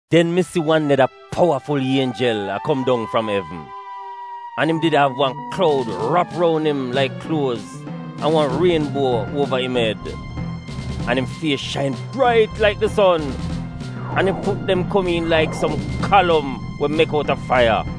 Den mi si wan neda powaful ienjel a kom dong fram evn. An im did av wan kloud rap roun im laik kluoz, an wan rienbuo uova im ed. An im fies shain brait laik di son. An im fut dem komiin laik som kalom we mek outa faiya.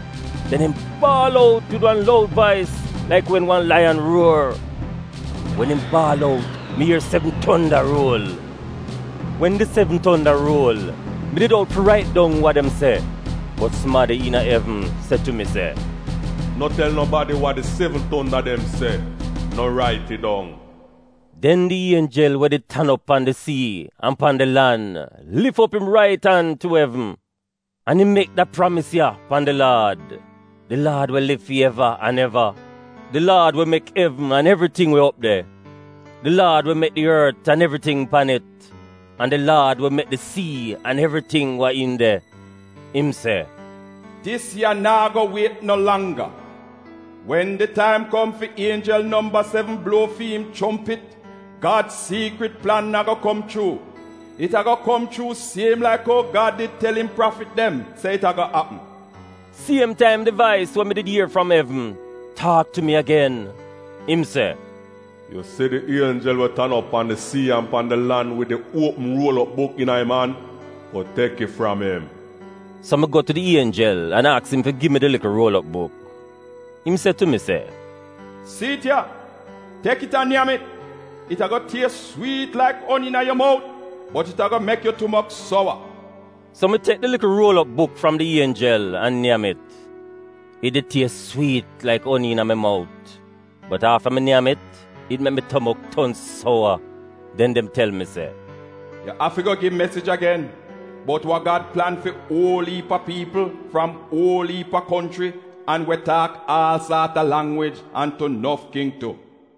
Den im baal out wid wan loud vais laik wen wan laiyan ruor. Wen im baal out mi ier sevn tonda ruol. Wen di sevn tonda ruol, mi did out fi rait dong wa dem se. Bot sumadi iina evn se tu mi se, “No tel nobadi wa di sevn tonda dem se. No rait it dong.” Den di ienjel we did tan op pan di sii an pan di lan lif op im rait an tu evn. An im mek da pramis ya pan di Laad — di laad we liv fi eva an eva, di laad we mek evn an evriting we op de, di laad we mek di ort an evriting pan it, an di laad we mek di sii an evriting wa iin de, im se, “Dis ya naa go wiet no langga! Wen di taim kom fi ienjel nomba sevn bluo fi'im chompit, Gad siikrit plan ago kom chuu. It ago kom chuu siem laik ou Gad did tel im prafit dem se it ago apm.” Siem taim di vais we mi did ier fram evn taak tu mi agen. Im se, “Yu si di ienjel we tan op pan di sii an pan di lan wid di uopm ruol op buk iina im an, go tek it fram im.” So mi go tu di ienjel an aks im fi gi mi di likl ruol op buk. Im se tu mi se, “Si'it ya. Tek it an nyam it. It ago ties swiit laik oni iina yu mout, bot it ago mek yu tumok sowa.” So mi tek di likl ruol op buk fram di ienjel an nyam it. It did ties swiit laik oni iina mi mout, bot afta mi nyam it, it mek mi tumok ton sowa. Den dem tel mi se, “Yu afi go gi mesij agen bout wa Gad plan fi uol iip a piipl, fram uol iip a konchri, an we taak aal saat a langwij, an tu nof king tu.”